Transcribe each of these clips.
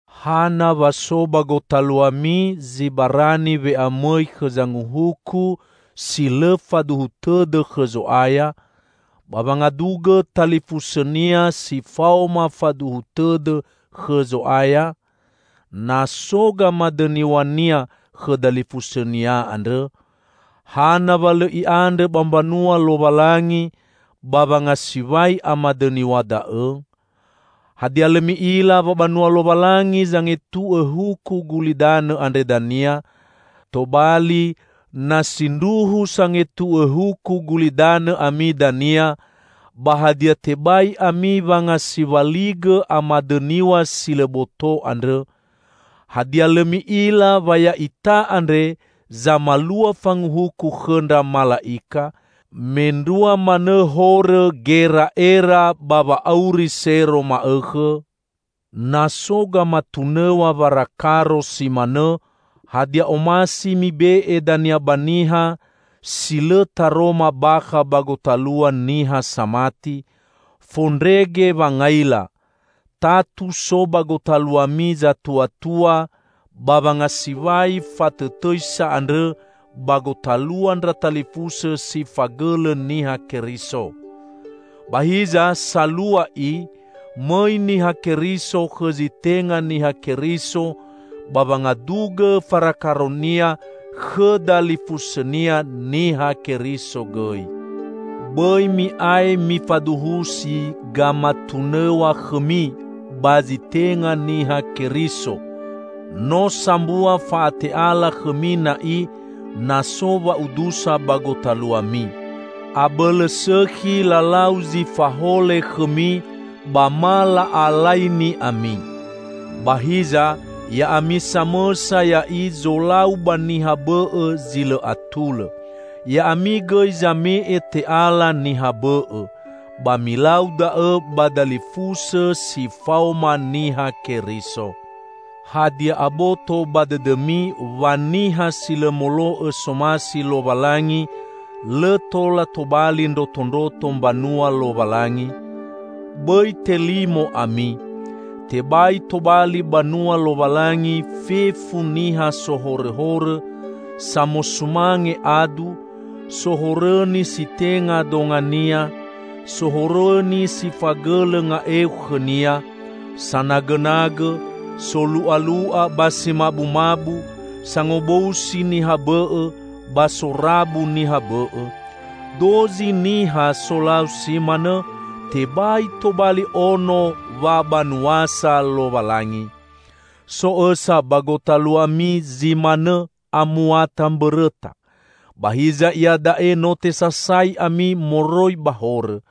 Hana wa so ba gotaluami zi barani we'amõi khõ zanguhuku si lõ faduhu tõdõ khõ Zo'aya, ba wangadugõ talifusõnia si faoma faduhu tõdõ khõ Zo'aya, na so gamadõniw̃ania khõ dalifusõnia andrõ? Hana wa lõ i'andrõ ba mbanua Lowalangi ba wangasiwai amadõniw̃a da'õ? Hadia lõ mi'ila wa banua Lowalangi zangetu'õ huku gulidanõ andre dania? Tobali, na sindruhu sangetu'õ huku gulidanõ ami dania, ba hadia tebai ami wangasiwaligõ amadõniw̃a si lõ boto andrõ? Hadia lõ mi'ila wa ya'ita andre zamalua fanguhuku khõndra mala'ika? Mendrua manõ horõ gera'era ba wa'auri sero ma'õkhõ! Na so gamatunõw̃a warakaro si manõ, hadia omasi mibe'e dania ba niha, si lõ taroma bakha ba gotalua niha samati? Fondrege wangaila! Tatu so ba gotaluami zatuatua ba wangasiwai fatõtõisa andrõ ba gotalua ndra talifusõ si fagõlõ Niha Keriso! Ba hiza, salua i, mõi Niha Keriso khõ zi tenga Niha Keriso ba wangadugõ farakaronia khõ dalifusõnia Niha Keriso gõi. Bõi mi'ae mifaduhusi gamatunõw̃a khõmi ba zi tenga Niha Keriso; no sambua fa'ate'ala khõmi na'i na so wa'udusa ba gotaluami. Abõlõ sõkhi lalau zi fahole khõmi, ba ma la'alaini ami. Ba hiza, ya'ami samõsa ya'i zolau ba niha bõ'õ zi lõ atulõ. Ya'ami gõi zame'e te'ala niha bõ'õ. Ba milau da'õ ba dalifusõ si faoma Niha Keriso! Hadia aboto ba dõdõmi wa niha si lõ molo'õ somasi Lowalangi, lõ tola tobali ndrotondroto mbanua Lowalangi? Bõi telimo ami. Tebai tobali banua Lowalangi fefu niha sohorõhorõ, samosumange adu, sohorõni si tenga dongania, sohorõni si fagõlõ nga'eu khõnia, sanagõnagõ, solu'alu'a ba si mabumabu, sangobousi niha bõ'õ, ba sorabu niha bõ'õ. Dozi niha solau si manõ, tebai tobali ono wabanuasa Lowalangi. So õsa ba gotaluami zi manõ amuata mbõrõta. Ba hiza iada'e no tesasai ami moroi ba horõ.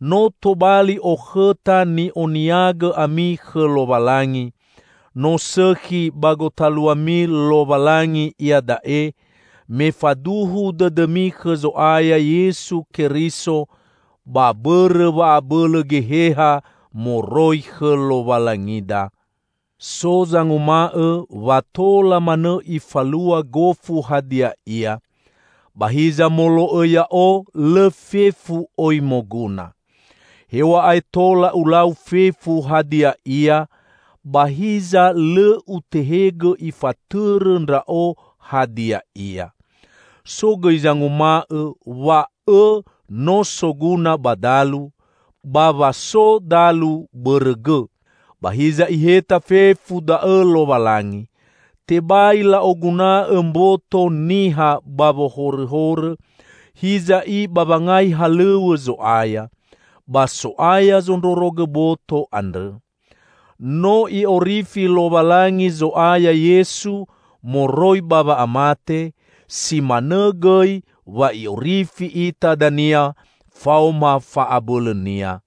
No tobali okhõta ni'oniagõ ami khõ Lowalangi. No sõkhi ba gotaluami Lowalangi iada'e, me faduhu dõdõmi khõ Zo'aya Yesu Keriso ba bõrõ wa'abõlõ Geheha moroi khõ Lowalangida. So zanguma'õ wa tola manõ ifalua gofu hadia ia. Ba hiza molo'õ ya'o lõ fefu oi moguna. Hew̃a'ae tola ulau fefu hadia ia, ba hiza lõ utehegõ ifatõrõ ndra'o hadia ia. So gõi zanguma'õ wa õ no soguna ba dalu, ba wa so dalu bõrõ gõ. Ba hiza Iheta fefu da'õ Lowalangi. Tebai la'oguna'õ mboto niha ba wohorõhorõ, hiza i ba wangai halõw̃õ Zo'aya. Ba So'aya zondrorogõ boto andrõ. No I'orifi Lowalangi Zo'aya Yesu moroi ba wa'amate, si manõ gõi wa I'orifi ita dania faoma fa'abõlõ-Nia.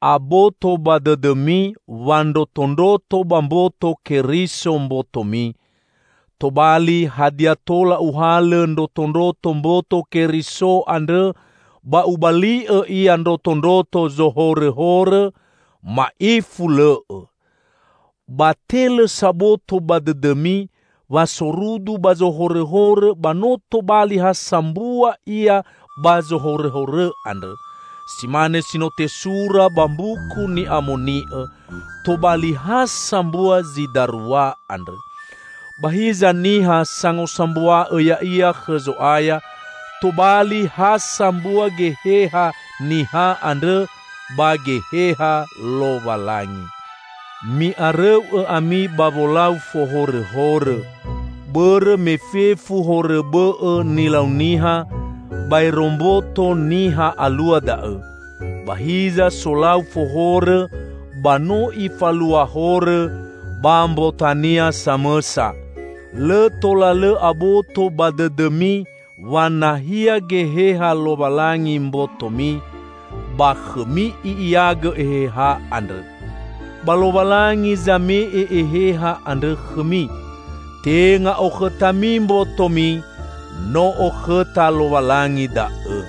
Aboto ba dõdõmi wa ndrotondroto ba mboto Keriso mbotomi. Tobali, hadia tola uhalõ ndrotondroto mboto Keriso andrõ ba ubali'õ ia ndrotondroto zohorõhorõ? Ma'ifu lõ'õ. Ba te lõ saboto ba dõdõmi wa sorudu ba zohorõhorõ ba no tobali ha sambua ia ba zohorõhorõ andrõ! Si mane si no tesura ba Mbuku Ni'amoni'õ, "Tobali ha sambua zi darua andrõ." Ba hiza niha sangosambua'õ ya'ia khõ Zo'aya, tobali ha sambua geheha niha andrõ ba Geheha Lowalangi. Mi'arõu'õ ami ba wolau fohorõhorõ. Bõrõ me fefu horõ bõ'õ nilau niha, baero mboto niha alua da'õ. Ba hiza solau fohorõ, ba no ifalua horõ ba mbotania samõsa! Lõ tola lõ aboto ba dõdõmi wa nahia Geheha Lowalangi mbotomi! Ba khõmi I'iagõ Eheha andrõ. Ba Lowalangi zame'e Eheha andrõ khõmi. Tenga okhõtami mbotomi, no okhõta Lowalangi da'õ.